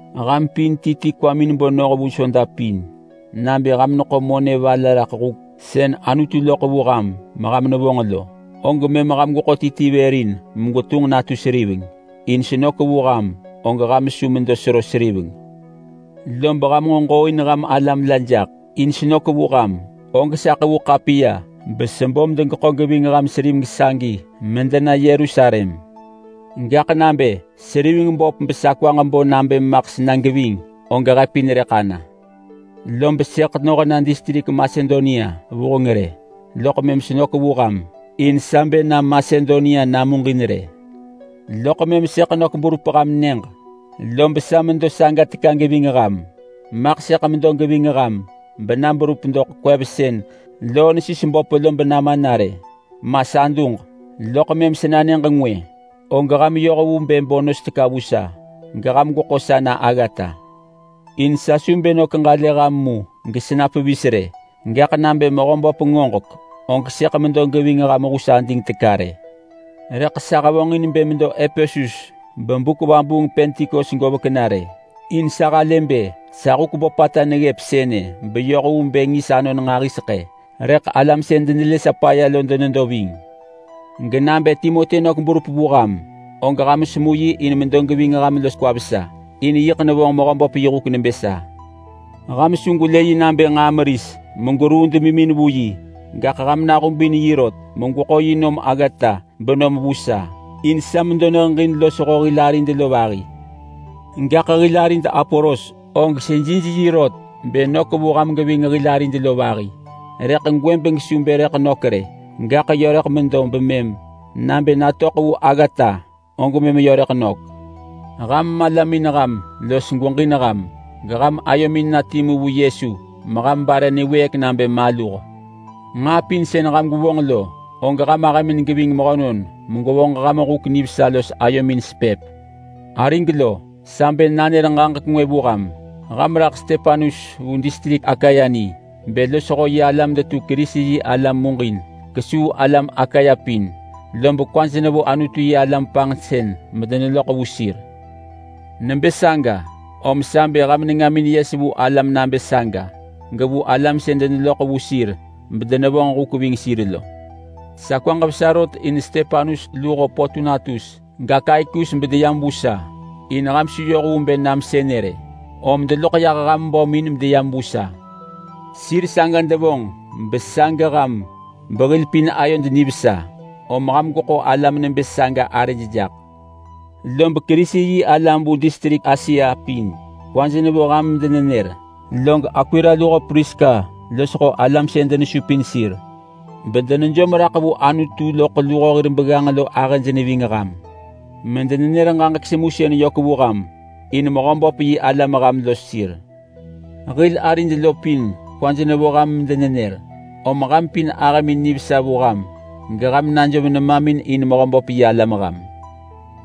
Ham pin ti ti kwamin bo noh vu Soda pin nabë ham neḳo monë va la raḳ huk sën Anutu loḳ vu ham meham nevonġ lo, og mëm ham gweḳo ti ti vër in megwetunġ natu seriveng, in senök vu ham og ham su medo sero seriveng. Lob ham nġo ġooin ham alam la jaḳ, in senök vu ham og sa ḳevu ḳapiya besebo medegeḳo geving ham seriveng sagi medena Yerusalem. Gaḳ nabë seriveng böp besa kwaġ bo nabë maḳ sena geving, og he pin rëḳ ana. Lob sëḳ noh na distrik Masedonia vuheng rë, loḳ mëm senök vu ham. In sa bë na Masedonia namuġin rë. Loḳ mëm sëḳ nök berup ham nyëġ, lob sa medo saga teka geving ham. Maḳ sëḳ medo geving ham bena berup doḳ kwev sën loo nesis böp lo benama na rë ma sa duġ. Loḳ mëm sena nyëġ ngwë, og ham yoh vu bë bo nos teka vu sa geham gweḳo sa na aggata. In sa su bë nök ġalë ham mu gesena pevis rë, gaḳ nabë Mehöböp ngoġek, og sëḳ medo geving ham hus ading teka rë. Rëḳ sa hevonġin bë medo Epesus bebuk vabuung Pentikos govek na rë. In sa halë bë sa huk böpata neggëp sënë beyoh vu bë ngis anon nġahiseḳë, rëḳ alam sën denelë sa paya lo denedo ving. Genabë Timoti nök berup vu ham, og ham semu yi in medo geving ham los kwa vesa, in yiḳ nevonġ Mehöböp yi huk nebë sa. Ham su gwelë yi nabë nġaa meris megweruu demimin vu yi, gaḳ ham nahubin yi rot megweḳo yi nom aggata benom vu sa, in sa medo neheġin losho hil arid lo vahi. Gaḳ hil arid Apolos og sejij yi rot bë nök vu ham geving hil arid lo vahi, rëḳ gwëbeng su bë rëḳ nök rë, gaḳ yö rëḳ medo bemëm nabë natöḳ vu aggata og mëm yö rëḳ nök. Ham malamin ham los gweġin ham, geham ayomin na timu vu Yesu meham bare niwëëk nabë maluh. Nġaa pin sën ham gwevonġ lo, og ham ahëmin geving mehönon megwevonġ ham huk nivesa los ayomin sepëp. Arig lo, sa bë nanër ġaġek ngwë vu ham. Ham raḳ Stepanus vu distrik Akaya ni bë losho yi alam detu Kerisi-yi-alam muġin kesuu alam Akaya pin, lob kwaj nevo Anutu-yi-alam panġsën medeneloḳ vu sir. Nebë saga, om sa bë ham nengamin yes vu alam nabë saga, gevu alam sën deneloḳ vu sir bedenevonġ huk ving sir lo. Sa kwaġ vesa rot in Stepanus luho Potunatus gAkaikus bedeyam vu sa in ham su yoh vu bë nam sënë rë, om deloḳ yah ham bömin medeyam vu sa. Sir saga devonġ besa geham behil pin ayod nivesa, om ham gweḳo alam nebë saga arëj jaḳ. Lob Kerisi-yi-alam vu distrik Asia pin kwaj nevo ham medenenër. Log Akwila luho Priska losho alam sën denesupin sir bedenejom raḳ vu Anutu loḳ luho hir begganġ lo ahëj neving ham medenenër ġaġek semusën yök vu ham in Mehöböp yi alam ham los sir. Hil arid lo pin kwaj nevo ham medenenër. Om ham pin ahëmin nivesa vu ham geham najom nemamin in Mehöböp yi alam ham.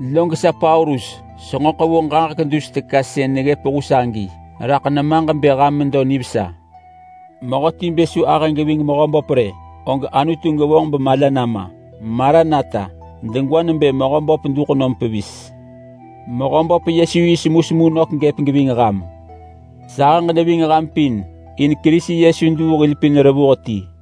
Log sa Paulus, senġo ḳevu ġaġek dus teka sën neggëp hus agi raḳ nemaġ bë ham medo nivesa. Mehöti bë su ahë geving Mehöböp rë, og Anutu gevonġ bemala nama. Maranata! (Degwa nebë Mehöböp duḳ nom pevis!) Mehöböp Yesu yi semusemu nök gëp geving ham. Sahëġ neving ham pin in Kerisi Yesu duu hil pin revuh ti.